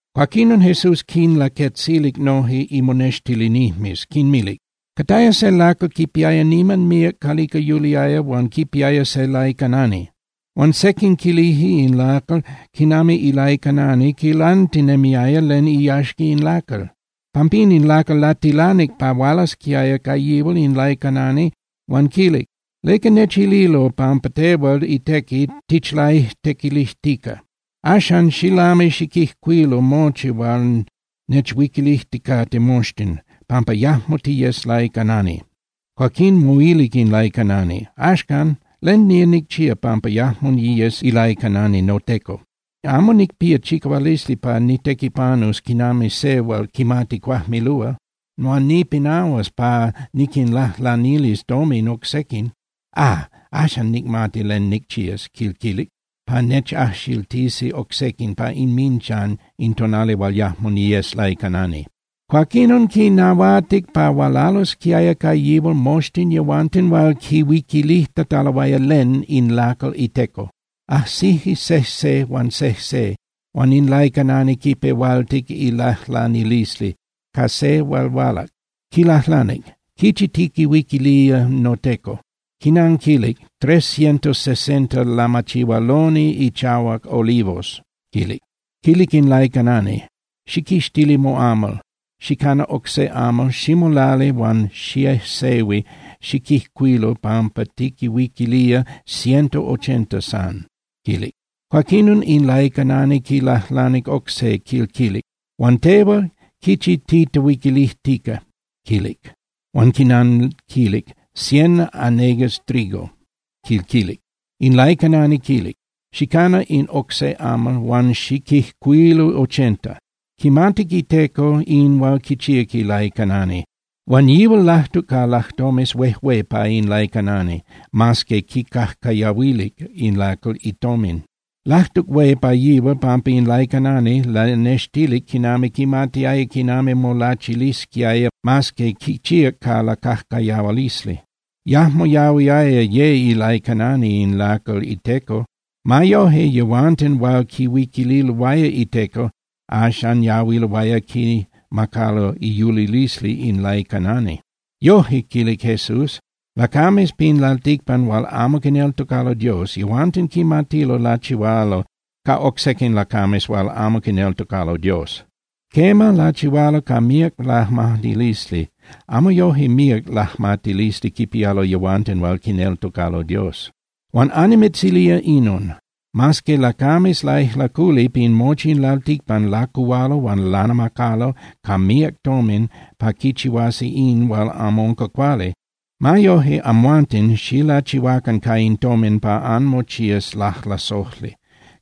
Cuaquinon Jesús quinlaquetzilic noje imonextilinijmes, quinmilic: —Cataya se lacal quipiaya niman míac calica yuliaya huan quipiaya se laicanani. Huan sequin quilije in lacal quinami ilaicanani quilantinemiaya len iyaxca in lacal. Pampín in lacal latilanic pa hualasquiaya ca yihual in laicanani huan quilic: “¿Leca nechililo pampa tehual itequi tichlaixtequilijtica? Axan, xilami xiquijcuilu mochi hual nechuiquilijticate moxtin, pampa yajmo tiyes laicanani.” Cuaquín moilic in laicanani: “Axcan, ¿len nía nicchía pampa yajmo niyes ilaicanani noteco? Amo nicpía chicahualisli pa nitequipanus quinami se hual quimati cuajmilúa, huan nipinahuas pa niquinlajlanilis tomin oc sequin. ¡Ah! Axan nicmati len nicchías”, quil quilic, “pa nechajxiltisi oc sequin pa inminchan in tonali hual yajmo niyes laicanani.” Cuaquinon quinnahuatic pa hualalosquiaya ca yihual moxtin yehuanten hual quihuiquilijtataloaya len in lacal iteco. Ajsije sejse huan sejse huan in laicanani quipehualtic ilajlanilisli ca se hual hualac, quilajlanic: “¿Quichi tiquihuiquilía noteco?” Quinanquilic: “Tres cientos sesenta lamachihualoni ichahuac olivos”, quilic. Quilic in laicanani: “Xiquixtili moamal, xicana oc se amal, ximolali huan xiejsehui xiquijcuilu pampa tiquihuiquilía ciento ochenta san”, quilic. Cuaquinon in laicanani quilajlanic oc se, quil quilic: “Huan tehual, ¿quichi titehuiquilijtica?”, quilic. Huan quinanquilic: “Cien hanegas trigo”, quil quilic. In laicanani quilic: “Xicana in oc se amal huan xiquijcuilu ochenta.” Quimatic iteco in hual quichíac ilaicanani, huan yihual lajtuc ca lajtomes huejué pa in laicanani, mas que quicajcayahuilic in lacal itomin. Lajtuc hué pa yihual pampa in laicanani lanextilic quinami quimatiaya quinami molachilisquiaya mas que quichíac ca lacajcayahualisli. Yajmo yahuiaya ye ilaicanani in lacal iteco. Ma yoje, yehuanten hual quihuiquililoaya iteco axan yahuiloaya quimacalo iyulilisli in laicanani. Yoje —quilic Jesús—, lacames pin lalticpan hual amo quineltocalo Dios, yehuanten quimatilo lachihualo ca oc sequin lacames hual amo quineltocalo Dios. Quema, lachihualo ca míac lajmatilisli, amo yoje míac lajmatilisli quipialo yehuanten hual quineltocalo Dios. ’Huan annimitzilía inon: Mas que lacames laijlaculi pin mochi in lalticpan lacuhualo huan lanamacalo ca míac tomin pa quichihuasi in hual amo unca cuali, ma yoje, amhuanten xilachihuacan ca in tomin pa anmochías lajlasojli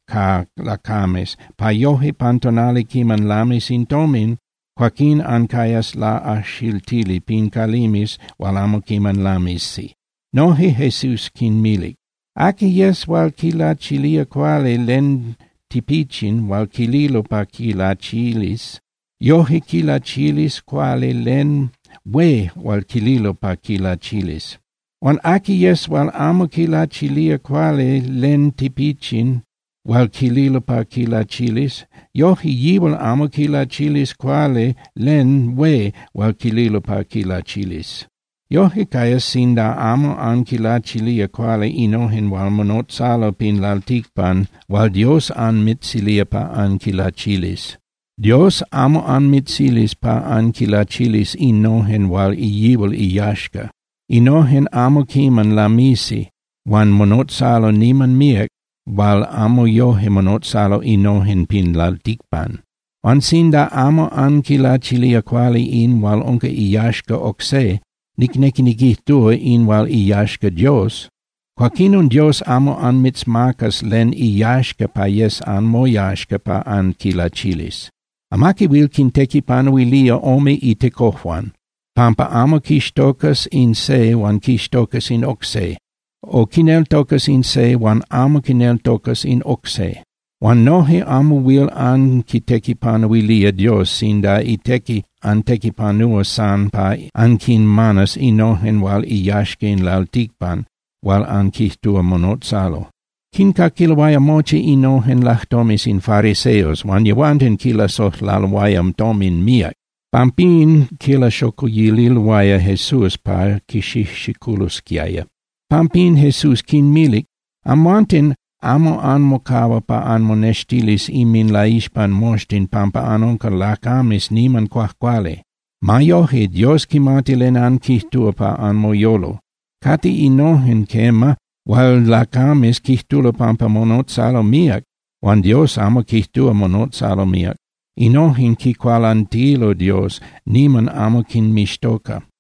ca lacames pa yoje pan tonali quiman lamis in tomin, cuaquín ancayas laꞌajxiltili pin calimes hual amo quiman lamisi. Noje Jesús quinmilic: —Aqui yes hual quilachilía cuali len tipichin hual quililo pa quilachilis, yoje quilachilis cuali len hué hual quililo pa quilachilis. Huan aqui yes hual amo quilachilía cuali len tipichin hual quililo pa quilachilis, yoje yíal amo quilachilis cuali len hué hual quililo pa quilachilis. Yoje cayas sinda amo anquilachilía cuali innojen hual monotzalo pin lalticpan hual Dios anmitzilía pa anquinlachilis. Dios amo anmitzilis pa anquinlachilis innojen hual yihual iyaxca. Innojen amo quiman lamisi huan monotzalo niman míac hual amo yoje monotzalo innojen pin lalticpan. Huan sinda amo anquilachilía cuali in hual unca iyaxca oc se, nicnequi niquijtúa, in hual iyaxca Dios, cuaquinon Dios amo anmitzmacas len iyaxca pa yes anmoyaxca pa anquilachilis. ’Amaqui huil quintequipanuilía ome itecojuan, pampa amo quixtocas in se huan quixtocas in oc se, o quineltocas in se huan amo quineltocas in oc se. Huan noje amo huil anquitequipanuilía Dios sinda itequi antequipanúa san pa anquinmanas innojen hual iyaxca in lalticpan hual anquijtúa monotzalo. Quincaquiloaya mochi innojen lajtomes in fariseos, huan yehuanten quilasojlaloaya tomin míac. Pampín quilaxocuyililoaya Jesús pa quixijxiculosquiaya. Pampín Jesús quinmilic: —Amhuanten amo anmocahua pa anmonextilis inminlaixpan moxtin pampa anunca lacames niman cuajcuali. Ma yoje, Dios quimati len anquijtúa pa anmoyolo. Cate innojen, quema, hual lacames quijtulo pampa monotzalo míac, huan Dios amo quijtúa monotzalo míac. Innojen quicualantilo Dios, niman amo quinmixtoca.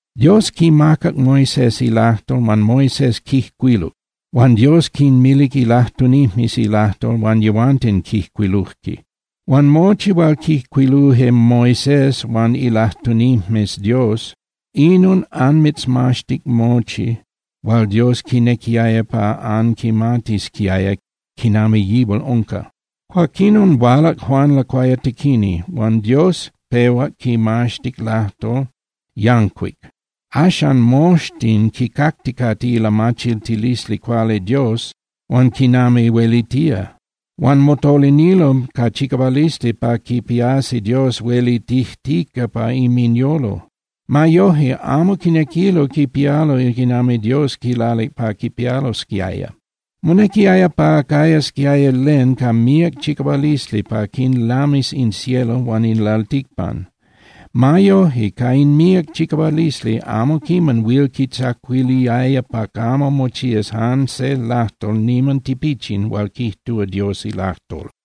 ’Dios quimacac Moisés ilajtol huan Moisés quijcuiluc. Huan Dios quinmilic ilajtunijmes ilajtol huan yehuanten quijcuiluje. Huan mochi hual quijcuiluje Moisés huan ilajtunijmes Dios, inon anmitzmaxtic mochi hual Dios quinequiaya pa anquimatisquiaya quinami yihual unca. Cuaquinon hualac Juan Lacuayatequini, huan Dios pehuac quimaxtic lajtol yancuic. Axan moxtin quicacticate ilamachiltilisli cuali Dios huan quinami huelitía. Huan motolinilo ca chicahualisli pa quipiasi Dios huelitijtica pa inminyolo. Ma yoje, amo quinequilo quipialo quinami Dios quilalic pa quipialosquiaya. Monequiaya pa cayasquiaya len ca míac chicahualisli pa quinlamis in cielo huan in lalticpan. Ma yoje, ca in míac chicahualisli, amo quiman huil quitzacuiliaya pa camo mochías jan se lajtol niman tipichin hual quijtúa Dios ilajtol.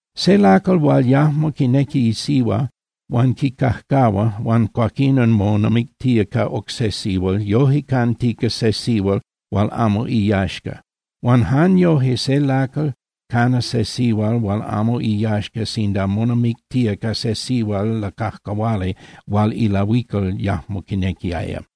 ’Se lacal hual yajmo quinequi isihua huan quicajcahua, huan cuaquinon monamictía ca oc se sihual yoje cantica se sihual hual amo iyaxca. Huan jan yoje se lacal cana se sihual hual amo iyaxca sinda monamictía ca se sihual lacajcahuali hual ilahuical yajmo quinequiaya.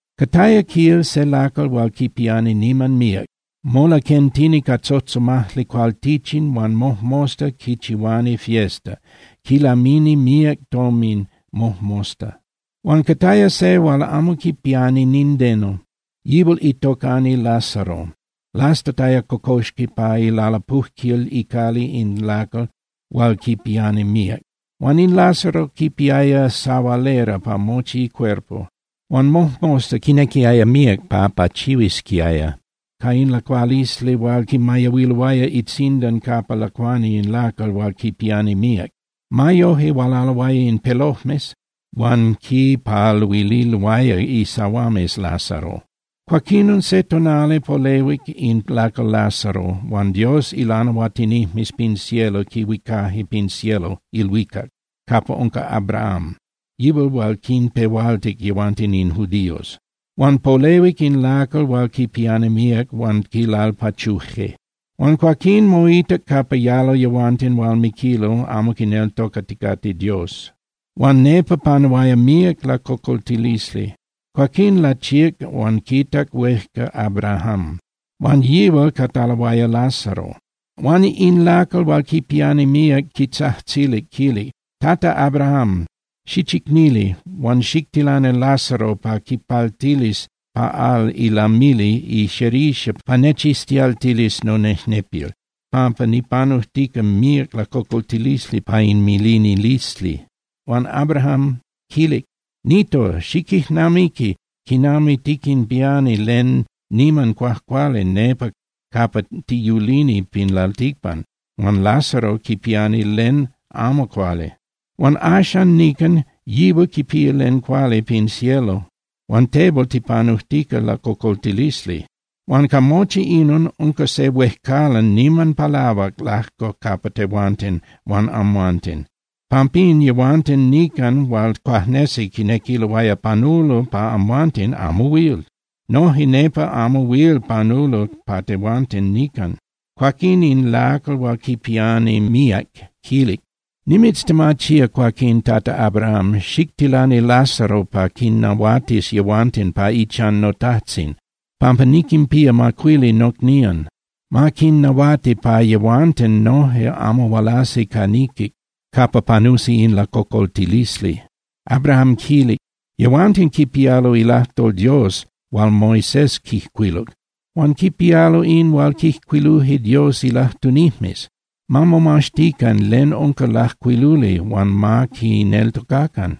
’Cataya, quil, se lacal hual quipiani niman míac. Molaquentini ca tzotzomajli cualtichin huan mojmosta quichihuani fiesta, quilamini míac tomin mojmosta. Huan cataya se hual amo quipiani nindeno, yihual itocani Lázaro, lastataya cocoxqui pa ilalapujquil icali in lacal hual quipiani míac. Huan in Lázaro quipiaya sahualera pa mochi icuerpo. Huan mojmosta quinequiaya míac pa pachihuisquiaya ca in lacualisli hual quimayahuiloaya itzindan capa lacuani in lacal hual quipiani míac. Ma yoje hualaloaya in pelojmes huan quipaluililoaya isahuames Lázaro. Cuaquinon se tonali polehuic in lacal Lázaro huan Dios ilanahuatinijmes pin cielo quihuicaje pin cielo (ilhuicac) capa unca Abraham, yihual hual quinpehualtic yehuanten in judíos. Huan polehuic in lacal hual quipiani míac huan quilalpachuje. Huan cuaquín moitac capa yalo yehuanten hual miquilo amo quineltocaticate Dios, huan nepa panuaya míac lacocoltilisli. Cuaquín lachíac huan quitac huejca Abrahám, huan yihual cataloaya Lázaro. Huan in lacal hual quipiani míac quitzajtzilic, quilic: “Tata Abrahám, xichicnili, huan xictilani Lázaro pa quipaltilis pa al ilamili ixerixa pa nechiztialtilis nonejnepil, pampa nipanujtica míac lacocoltilisli pa in milinilisli.” Huan Abraham quilic: “Nito, xiquijnamiqui quinami tiquinpiani len niman cuajcuali nepa capa tiyulini pin lalticpan, huan Lázaro quipiani len amo cuali. Huan axan nican yihual quipía len cuali pin cielo huan tehual tipanujtica lacocoltilisli. Huan ca mochi inon, unca se huejcalan niman palahuac lajco capa tehuanten huan amhuanten. Pampín yehuanten nican hual cuajnesi quinequiloaya panulo pa amhuanten amo huil. Noje nepa amo huil panulo pa tehuanten nican.” Cuaquín in lacal hual quipiani míac quilic: “Nimitztemachía cuaquín, Tata Abraham, xictilani Lázaro pa quinnahuatis yehuanten pa ichan notajtzin, pampa niquinpía macuili nocnían. Ma quinnahuati pa yehuanten noje amo hualasi ca niquic capa panusi in lacocoltilisli.” Abraham quilic: “Yehuanten quipialo ilajtol Dios hual Moisés quijcuiluc, huan quipialo in hual quijcuiluje Dios ilajtunijmes. Ma momaxtican len unca lajcuiluli huan ma quineltocacan.”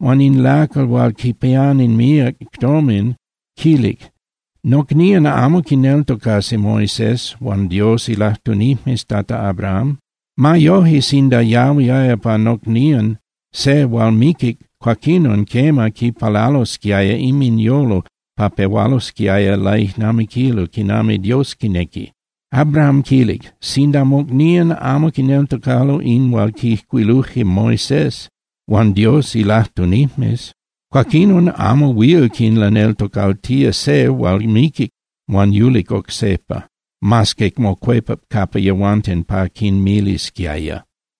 Huan in lacal hual quipiani míac tomin quilic: “Nocnían amo quineltocasi Moisés huan Dios ilajtunijmes, Tata Abrahám. Ma yoje, sinda yahuiaya pa nocnían se hual miquic, cuaquinon, quema, quipalalosquiaya inminyolo pa pehualosquiaya laijnamiquilo quinami Dios quinequi.” Abraham quilic: “Sinda mocnían amo quineltocalo in hual quijcuiluje Moisés huan Dios ilajtunijmes, cuaquinon amo huil quinlaneltocaltía se hual miquic huan yulic oc sejpa, mas que mocuepac capa yehuanten pa quinmilisquiaya.”